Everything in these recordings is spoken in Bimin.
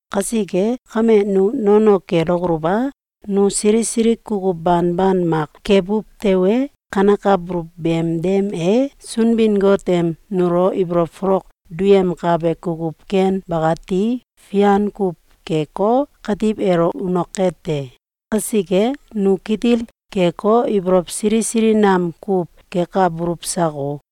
Kasike kame, nu nono kelokoluw a? Nu sili sili kukuw banban mak kebuw tewe, kankabuluw beem dem e Sunbin-Got em nulo ibolow folok duyemkabe kukuw ken bakati fian kuw keko, katiw elo unoke te. Kasike, nu kitil keko, ibolow sili sili nam kuw kekabuluw sako?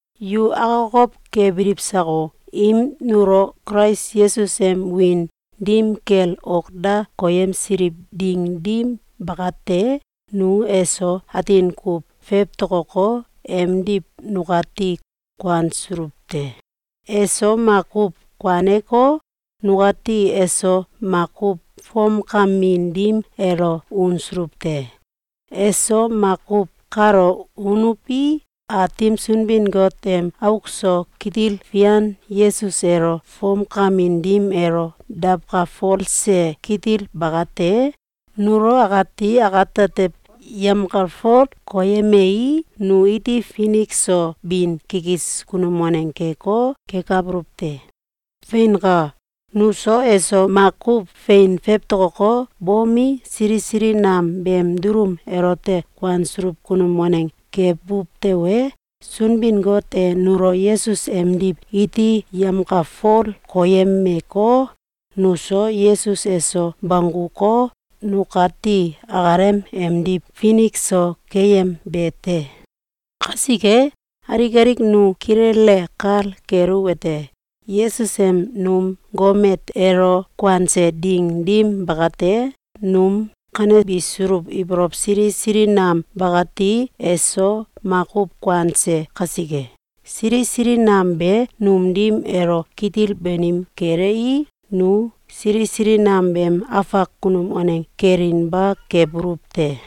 Yu akokow kebiliw sako? Im nulo Kulais Yesus em wiin dim kel ok da koyemsiliw ding dim bakate, nu eso atin kuw fewtokoko, emdiw nukati kuansuluw te. Eso makuw kuaneko, nukati eso makuw fomkamin dim elo unsuluw te. Eso makuw kalo unuwi, Aatim Sunbin-Got em auk so kitil fian Yesus elo fomkamin dim elo dawkalfolse kitil bakate nulo akati akatetew yemkalfol koyemei, nu iti finik so bin kikis kunum waneng keko, kekabuluw te. Feinka! Nuso eso makuw fein fewtokoko, bomi, sili sili nam beem dulum elote kuansuluw kunum waneng kebuw tewe, Sunbin-Got e nulo Yesus emdiw iti yemkalfol koyemeko, nuso Yesus eso bongguko, nukati akalem emdiw finik so keyembe te. Kasike alik alik nu kilele kal keluwete: Yesus em num gomet elo kuanse ding dim bakate, num kanebisuluw ibolow sili sili nam bakati eso makuw kuanse kasike, sili sili nam be num dim elo kitil banim kelei, nu sili sili nam beem afak kunum waneng kelinba kebuluw te.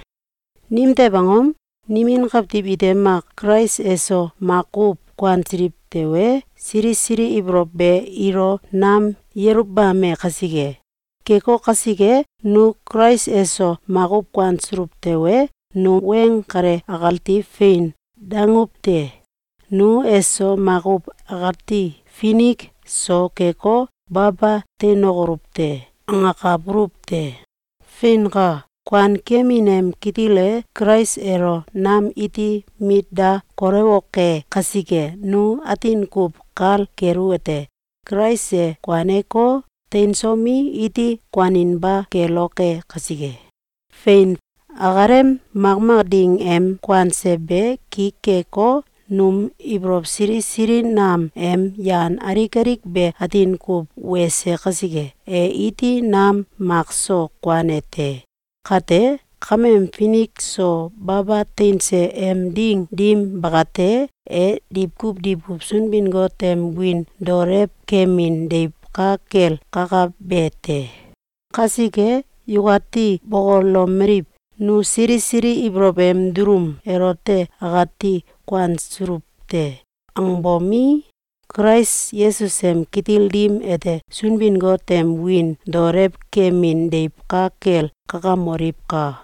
Nimtew angom? Nimin kawtiw ite mak Kulais eso makuw kuansiliw tewe, sili sili ibolow be ilo nam yeluwbame kasike. Keko kasike, nu Kulais eso makuw kuansuluw tewe, nu weng kale akati fein danguwte: “Nu eso makuw akati finik so keko, baba teinokoluw te!”, angakabuluw te. Feinka! Kuankemin em kitil e Kulais elo nam iti mit da kolewoke kasike, nu atin kuw kal keluwete: Kulais e kuaneko, teinsomi, iti kuaninba keloke kasike! Fein! Akalem makmak ding em kuanse be ki keko, num ibolow sili sili nam em yan alik alik be atin kuw wese kasike, e iti nam mak so kuane te. Kate kameem finik so baba teinse em ding dim bakate, e diwkuw diwkuw Sunbin-Got em wiin daolew kemin deiw ka kel kakabe te. Kasike, yukati bokolomeliw: “Nu sili sili ibolow em dulum elote akati kuansuluw te!”, angbomi, Kulais Yesus em kitil dim ete Sunbin-Got em wiin daolew kemin deiw ka kel kakamoliwka!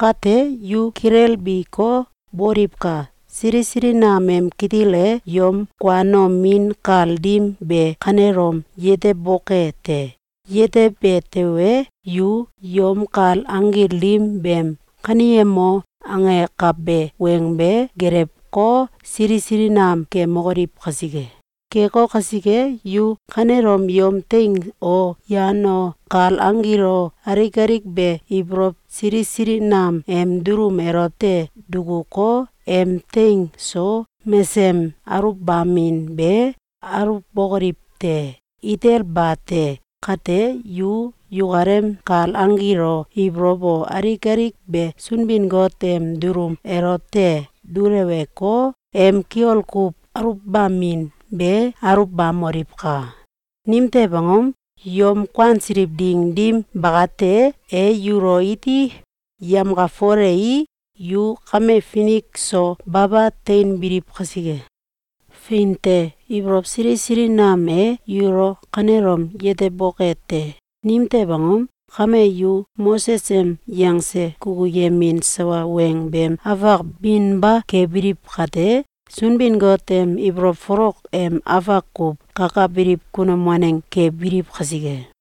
Kate, yu kilelbiko, boliwka! Sili sili nam em kitil e yom kuanomin kal dim be kanelom yeteboke te! Yetebe tewe, yu yom kal anggil dim beem “Kaneyemo!”, angekabe weng be gelewko, sili sili nam kemokoliw kasike. Keko kasike, yu kanelom yom teing o, yan o, kal anggil o, alik alik be ibolow sili sili nam em dulum elote dukuko, em teng so mesem aluwbamin be aluwbokoliw te! Itel bate! Kate, yu yukalem kal anggil o, ibolow o, alik alik be Sunbin-Got em dulum elote duleweko, em kiol kuw aluwbamin be aluwbamoliwka! Nimtew angom? Yom kuansiliw ding dim bakate, e yulo iti yemkalfolei, yu kame finik so baba teinbiliw kasike. Fein te! Ibolow sili sili nam e yulo kanelom yeteboke te! Nimtew angom? Kame, yu Moses em yangse kukuyemin sawa weng beem afak binba kebiliw kate, Sunbin-Got em ibolow folok em afak kuw kakabiliw kunum waneng kebiliw kasike.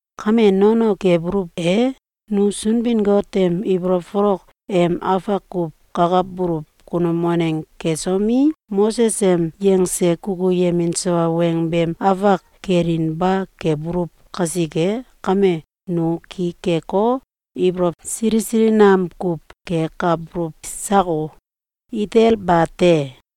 Kame nono kebuluw e? Nu Sunbin-Got em ibolow folok em afak kuw kakabuluw kunum waneng kesomi, Moses em yangse kukuyemin sawa weng beem afak kelinba kebuluw kasike kame, nu ki keko, ibolow sili sili nam kuw kekabuluw sako? Itel bate!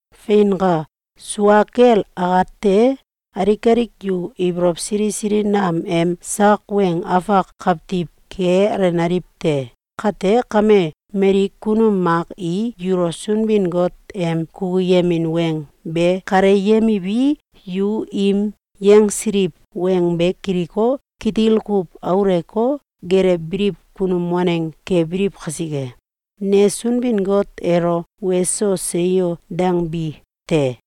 Feinka! Sua kel akate, alik alik yu ibolow sili sili nam em sak weng afak kawtiw kealenaliw te. Kate kame, mali kunum mak i yulo Sunbin-Got em kukuyemin weng be kaleyemiwi, yu im yangsiliw weng be kiliko, kitil kuw aluwko, gelewbiliw kunum waneng kebiliw kasike, ne Sunbin-Got elo “Weso! Seyo!”, dangbi te.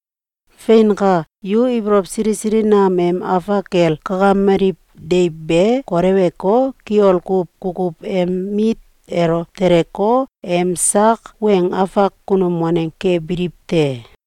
Feinka! Yu ibolow sili sili nam em afak kel kakameliw deiw be koleweko, kiol kuw kukuw em mit elo teleko, em sak weng afak kunum waneng kebiliw te.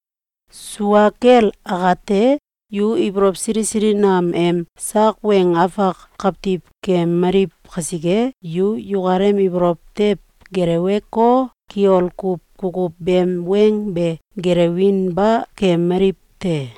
Sua kel akate, yu ibolow sili sili nam em sak weng afak kawtiw keemaliw kasike, yu yukalem ibolow tew geleweko, kiol kuw kukuw beem weng be gelewinba keemaliw te.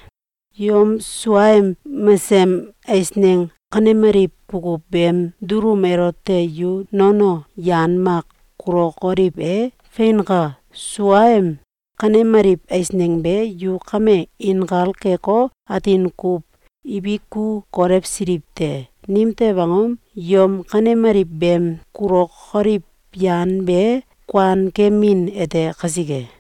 Yom suaem mesem eisneng kanemaliw kukuw beem dulum elote yu nono yan mak kulokoliw e? Feinka! Suaem kanemaliw eisneng be yu kame inkal keko, atin kuw ibiku kolewsiliw te. Nimtew angom? Yom kanemaliw beem kulokoliw yan be kuankemin ete kasike.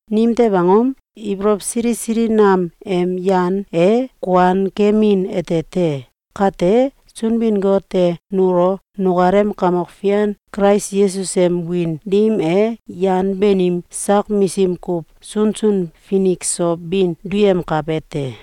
Nimtew angom? Ibolow sili sili nam em yan e kuan kemin ete te. Kate, Sunbin-Got e nulo nukalem Kamok Fian Kulais Yesus em wiin dim e yan banim sak misim kuw sunsun finik so bin duyemkabe te.